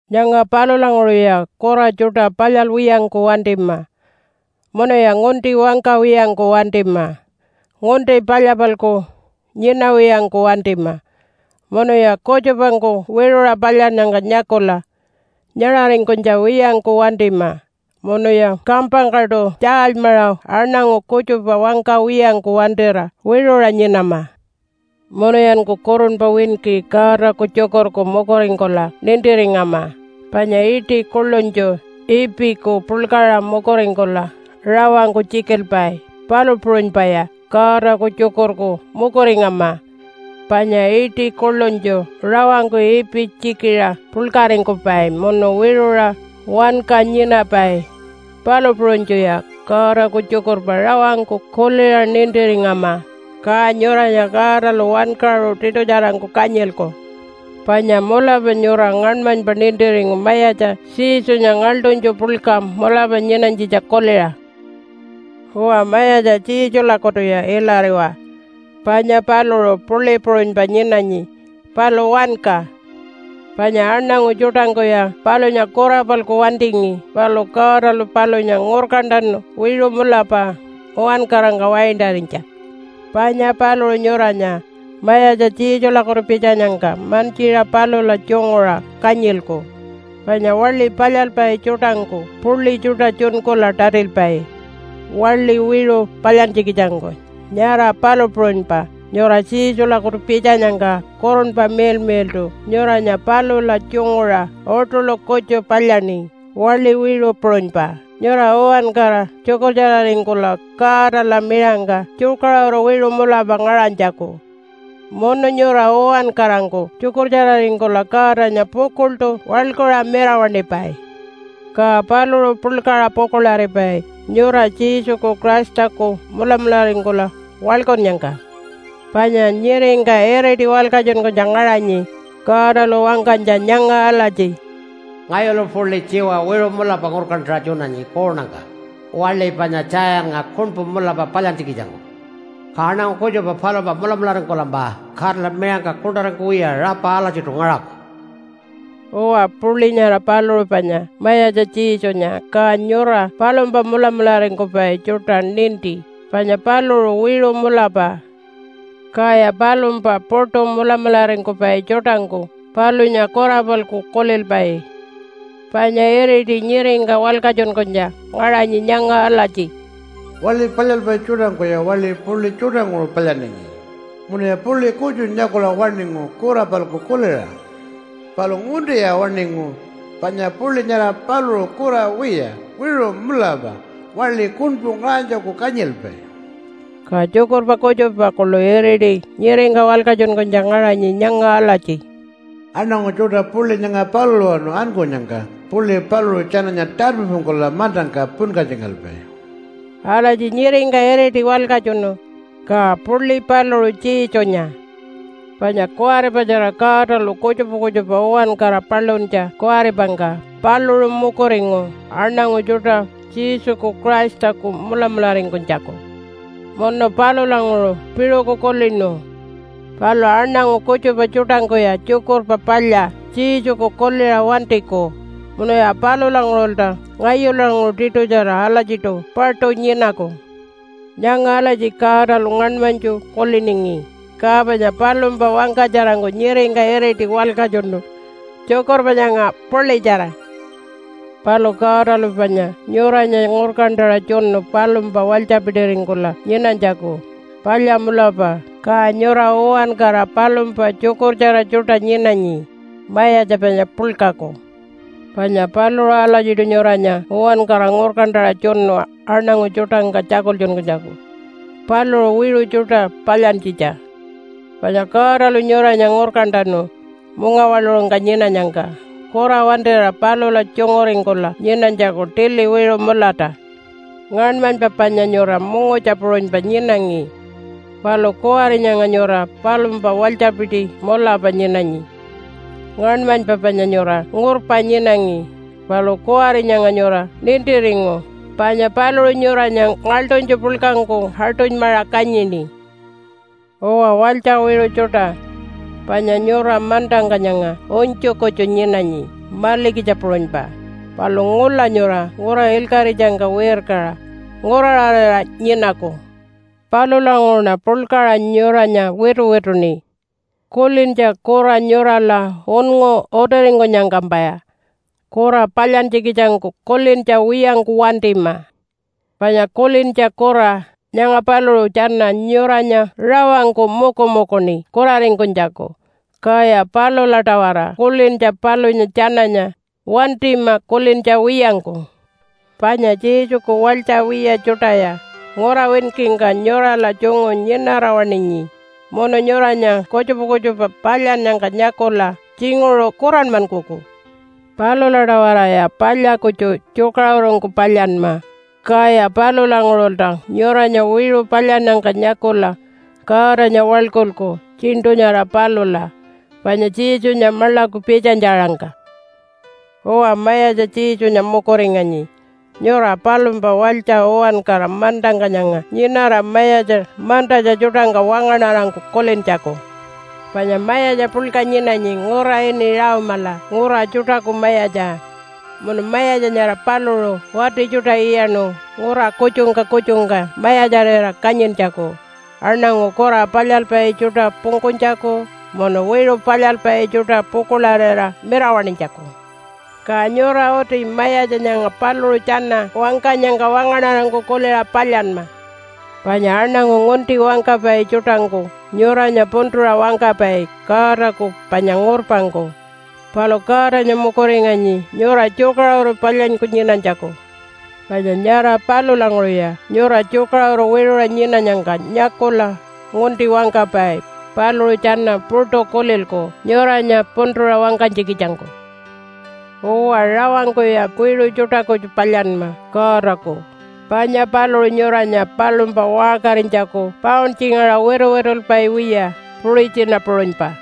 Nyanga palulanguṟuya kura tjuṯa palyalwiyangku wantima. Munuya ngunti wangkawiyangku wantima, ngunti palya-palku nyinawiyangku wantima, munuya kutjupangku wiṟuṟa palyannyangka nyakula nyaṟaringkunytja wiyangku wantima, munuya kampangkaṯu tjaalymaṟa aṉangu kutjupa wangkawiyangku wantira wiṟuṟa nyinama. Munuyanku kurunpa winki Godaku tjukurku mukuringkula nintiringama, panya iṯi kuḻunytju ipiku puḻkaṟa mukuringkula rawangku tjikilpai, palu puṟunypaya Godaku tjukurku mukuringama. Panya iṯi kuḻunytju rawangku ipi tjikiṟa puḻkaringkupai munu wiṟuṟa wanka nyinapai, palu puṟunytjuya Godaku tjukurpa rawangku kuliṟa nintiringama, ka nyuranya Godalu wankaṟu tiṯutjarangku kanyilku. Panya mulapa nyura ngaṉmanypa nintiringu Mayatja Jesunya ngaḻṯunytju puḻka mulapa nyinanytjitja kuliṟa. Uwa, Mayatja Jesulakutuya ilariwa, panya paluṟu puḻi puṟunypa nyinanyi palu wanka. Panya aṉangu tjuṯangkuya palunya kura-palku wantingi, palu Godalu palunya ngurkantanu wiṟu mulapa uwankarangka waintarinytja. Panya paluṟu nyuranya Mayatja Jesulakutu pitjanyangka mantjiṟa palula tjunguṟa kanyilku, panya waḻi palyalpai tjuṯangku puḻi tjuṯa tjunkula tatilpai waḻi wiṟu palyantjikitjangku, nyara palu puṟunypa nyura Jesulakutu pitjanyangka Kurunpa Miḻmiḻṯu nyuranya palula tjunguṟa uṯuḻu kutju palyaṉi waḻi wiṟu puṟunypa nyura uwankara tjukurtjararingkula Godala miṟangka tjukaṟuru wiṟu mulapa ngaṟanytjaku. Munu nyura uwankarangku tjukurtjararingkula Godanya pukuḻṯu waḻkuṟa mirawaṉipai. Ka paluṟu puḻkaṟa pukuḻaripai nyura Jesuku Christaku mulamularingkula waḻkunnyangka. Panya nyiringka iriti walkatjunkunytja ngaṟanyi Godalu wangkanytja nyanga alatji, “Ngayulu puḻi tjiwa wiṟu mulapa ngurkantaṟa tjunanyi kuunangka waḻi panya Tjayannga kuṉpu mulapa palyantjikitjangku. Ka aṉangu kutjupa palumpa mulamularingkulampa Godala miṟangka kuṉṯaringkuwiya rapa alatjiṯu ngaṟaku.” Uwa, puḻi nyara paluṟu panya Mayatja Jesunya, ka nyura palumpa mulamularingkupai tjuṯa ninti panya paluṟu wiṟu mulapa. Kaya palumpa puṯu mulamularingkupai tjuṯangku palunya kura-palku kulilpai. Panya iriti nyiringka walkatjunkunytja ngaṟanyi nyanga alatji, “Waḻi palyalpai tjuṯangkuya waḻi puḻi tjuṯanguṟu palyaningi, munuya puḻi kutju nyakula waṉingu kura-palku kuliṟa. Palu nguntiya waṉingu, panya puḻi nyara paluṟu kura wiya, wiṟu mulapa waḻi kuṉpu ngaṟanytjaku kanyilpai.” Ka tjukurpa kutjupa kuḻu iriti nyiringka walkatjunkunytja ngaṟanyi nyanga alatji, “Aṉangu tjuṯa puḻi nyanga palulawanu ankunyangka puḻi paluṟu tjananya tarpipungkula mantangka punkatjingalpai.” Alatji nyiringka iriti walkatjunu, ka puḻi paluṟu Jesunya, panya kuwaripatjara Godalu kutjupa kutjupa uwankara paluntja kuwaripangka paluṟu mukuringu aṉangu tjuṯa Jesuku Christaku mulamularingkunytjaku. Munu palulanguṟu piṟuku kulinu, “Palu aṉangu kutjupa tjuṯangkuya Tjukurpa Palya Jesuku kuliṟa wantiku, munuya palulanguṟulta ngayulanguṟu tiṯutjara alatjiṯu paṯu nyinaku.” Nyanga alatji Godalu ngaṉmanytju kuliningi, ka panya palumpa wangkatjarangku nyiringka iriti walkatjunu tjukurpa nyanga puḻitjara. Palu Godalu panya nyuranya ngurkantaṟa tjunu palumpa walytjapitiringkula nyinanytjaku palya mulapa, ka nyura uwankara palumpa tjukurtjara tjuṯa nyinanyi, Mayatja panya puḻkaku. Panya paluṟu alatjiṯu nyuranya uwankara ngurkantaṟa tjunu aṉangu tjuṯangka tjakultjunkunytjaku paluṟu wiṟu tjuṯa palyantjitja. Panya Godalu nyuranya ngurkantanu mungawaḻuṟungka nyinanyangka kura wantira palula tjunguringkula nyinanytjaku tili wiṟu mulata. Ngaṉmanypa panya nyura mungutja puṟunypa nyinangi. Palu kuwari nyanga nyura palumpa walytjapiti mulapa nyinanyi. Ngaṉmanypa panya nyura ngurpa nyinangi, palu kuwari nyanga nyura nintiringu panya paluṟu nyuranya ngaḻṯunytju puḻkangku aṯunymaṟa kanyini. Uwa walytja wiṟu tjuṯa, panya nyura mantangka nyanga unytju kutju nyinanyi malikitja puṟunypa, palu ngula nyura ngura ilkaṟitjangka wirkaṟa nguraṟarira nyinaku. Palulanguṟuṉa puḻkaṟa nyuranya wituwituṉi, “Kulintja kura nyurala unngu utiringkunyangkampaya kura palyantjikitjangku kulintja wiyangku wantima. Panya kulintja kura nyanga paluṟu tjana nyuranya rawangku mukumukuṉi kuraringkunytjaku, kaya palula-tawara kulintja palunya tjananya wantima kulintja wiyangku.” Panya Jesuku walytja wiya tjuṯaya ngura winkingka nyurala tjungu nyinara-waṉinyi munu nyuranya kutjupa kutjupa palyannyangka nyakula tjinguṟu kuranmankuku. Palula-tawaraya palya kutju tjukaṟurungku palyanma, kaya palulanguṟulta nyuranya wiṟu palyannyangka nyakula Godanya waḻkulku tjiṉṯu nyara palula panya Jesunya maḻaku pitjanytja-aṟangka. Uwa, Mayatja Jesunya mukuringanyi nyura palumpa walytja uwankara mantangka nyanga nyinara mayatja mantatja tjuṯangka wangaṉarangku kulintjaku. Panya mayatja puḻka nyinanyi ngura ini Rome-ala ngura tjuṯaku mayatja munu mayatja nyara paluṟu wati tjuṯa iyaṉu ngura kutjungka kutjungka mayatjarira kanyintjaku, aṉangu kura palyalpai tjuṯa pungkunytjaku munu wiṟu palyalpai tjuṯa pukuḻarira mirawaṉinytjaku. Ka nyura uti mayatja nyanga paluṟu tjana wangkanyangka wangaṉarangku kuliṟa palyanma. Panya aṉangu ngunti wangkapai tjuṯangku nyuranya puntuṟa wangkapai Godaku panya ngurpangku. Palu Godanya mukuringanyi nyura tjukaṟuru palyanyku nyinanytjaku. Panya nyara palulanguṟuya nyura tjukaṟuru wiṟuṟa nyinanyangka nyakula ngunti wangkapai paluṟu tjana puṯu kulilku nyuranya puntuṟa wangkanytjikitjangku. Uwa, rawangkuya wiṟu tjuṯa kutju palyanma Godaku, panya paluṟu nyuranya palumpa waṟkarinytjaku pauntjingaṟa wituwitulpai wiya puṟitjina puṟunypa.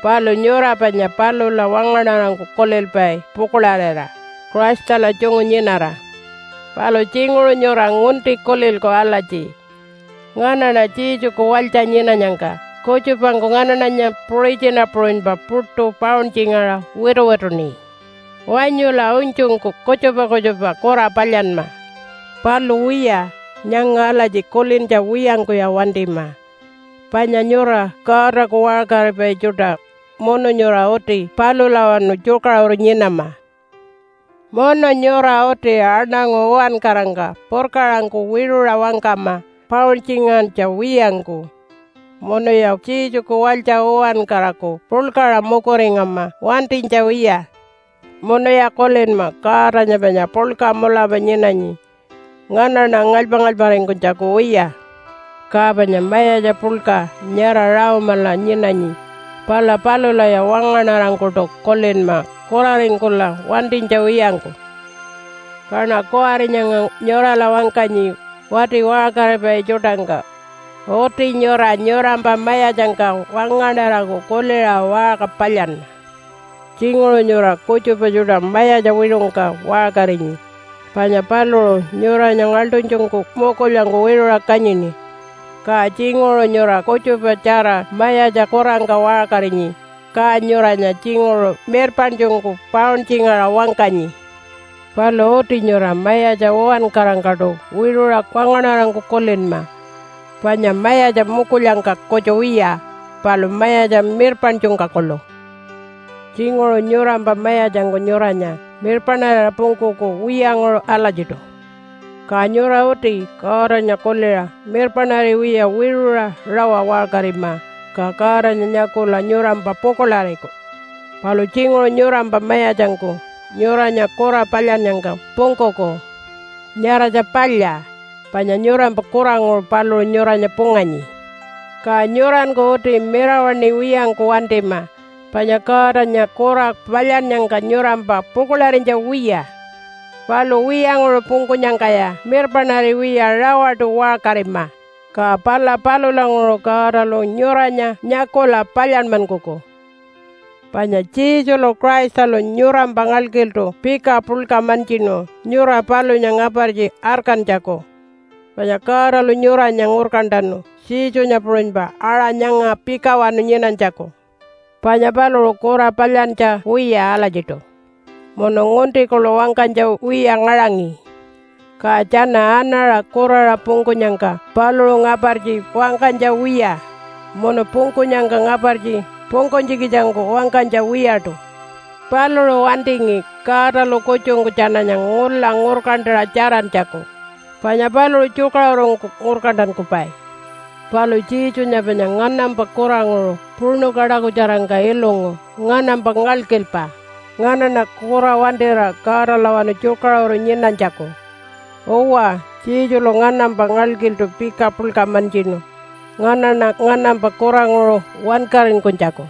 Palu nyura panya palula wangaṉarangku kulilpai pukuḻarira, Christala tjungu nyinara. Palu tjinguṟu nyura ngunti kulilku alatji, “Nganaṉa Jesuku walytja nyinanyangka kutjupangku nganaṉanya puṟitjina puṟunypa puṯu pauntjingaṟa wituwituṉi. Wanyula unytjungku kutjupa kutjupa kura palyanma.” Palu wiya, nyanga alatji kulintja wiyangkuya wantima panya nyura Godaku waṟkaripai tjuṯa munu nyura uti palulawanu tjukaṟuru nyinama. Munu nyura uti aṉangu uwankarangka purkaṟangku wiṟuṟa wangkama pauntjingantja wiyangku. Munuya Jesuku walytja uwankaraku puḻkaṟa mukuringama wantinytja wiya. Munuya kulinma Godanya panya puḻka mulapa nyinanyi nganaṉa ngalypa-ngalyparingkunytjaku wiya. Ka panya mayatja puḻka nyara Rome-ala nyinanyi, pala palulaya wangaṉarangkuṯu kulinma kuraringkula wantinytja wiyangku. Kaṉa kuwari nyanga nyurala wangkanyi wati waṟkaripai tjuṯangka. Uti nyura nyurampa mayatjangka wangaṉarangku kuliṟa waṟka palyanma. Tjinguṟu nyura kutjupa tjuṯa mayatja wiṟungka waṟkarinyi panya paluṟu nyuranya ngaḻṯunytjungku mukulyangku wiṟuṟa kanyini. Ka tjinguṟu nyura kutjupatjara mayatja kurangka waṟkarinyi, ka nyuranya tjinguṟu mirpaṉtjungku pauntjingaṟa wangkanyi. Palu uti nyura mayatja uwankarangkaṯu wiṟuṟa wangaṉarangku kulinma panya mayatja mukulyangka kutju wiya, palu mayatja mirpaṉtjungka kuḻu. Tjinguṟu nyurampa mayatjangku nyuranya mirpaṉarira pungkuku wiyanguṟu alatjiṯu, ka nyura uti Godanya kuliṟa mirpaṉariwiya wiṟuṟa rawa waṟkarima, ka Godanya nyakula nyurampa pukuḻariku. Palu tjinguṟu nyurampa mayatjangku nyuranya kura palyannyangka pungkuku. Nyaratja palya, panya nyurampa kuranguṟu paluṟu nyuranya punganyi. Ka nyuranku uti mirawaṉiwiyangku wantima panya Godanya kura palyannyangka nyurampa pukuḻarinytja wiya. Palu wiyanguṟu pungkunyangkaya mirpaṉariwiya rawaṯu waṟkarima, ka pala palulanguṟu Godalu nyuranya nyakula palyanmankuku. Panya Jesulu Christalu nyurampa ngalkiltu pika puḻka mantjinu nyura palunya ngapartji arkantjaku. Panya Godalu nyuranya ngurkantanu Jesunya puṟunypa aṟa nyanga pikawanu nyinanytjaku. Panya paluṟu kura palyantja wiya alatjiṯu, munu ngunti kuḻu wangkanytja wiya ngaṟangi. Ka tjana anaṟa kuraṟa pungkunyangka paluṟu ngapartji wangkanytja wiya, munu pungkunyangka ngapartji pungkunytjikitjangku wangkanytja wiyaṯu. Paluṟu wantingi Godalu kutjungku tjananya ngula ngurkantaṟa tjarantjaku, panya paluṟu tjukaṟurungku ngurkantankupai. Palu Jesunya panya nganampa kuranguṟu puṉu kaṯakutjarangka ilungu nganampa ngalkilpa, nganaṉa kura wantira Godalawanu tjukaṟuru nyinanytjaku. Uwa, Jesulu nganampa ngalkiltu pika puḻka mantjinu nganaṉa nganampa kuranguṟu wankaringkunytjaku.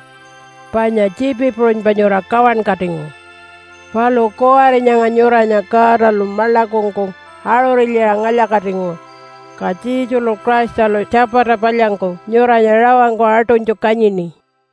Panya tjiipi puṟunypa nyura kawankatingu. Palu kuwari nyanga nyuranya Godalu maḻakungku aṟuṟilyiṟa ngalya-katingu, ka Jesulu Christalu tjapata palyangku nyuranya rawangku aṯunytju kanyini.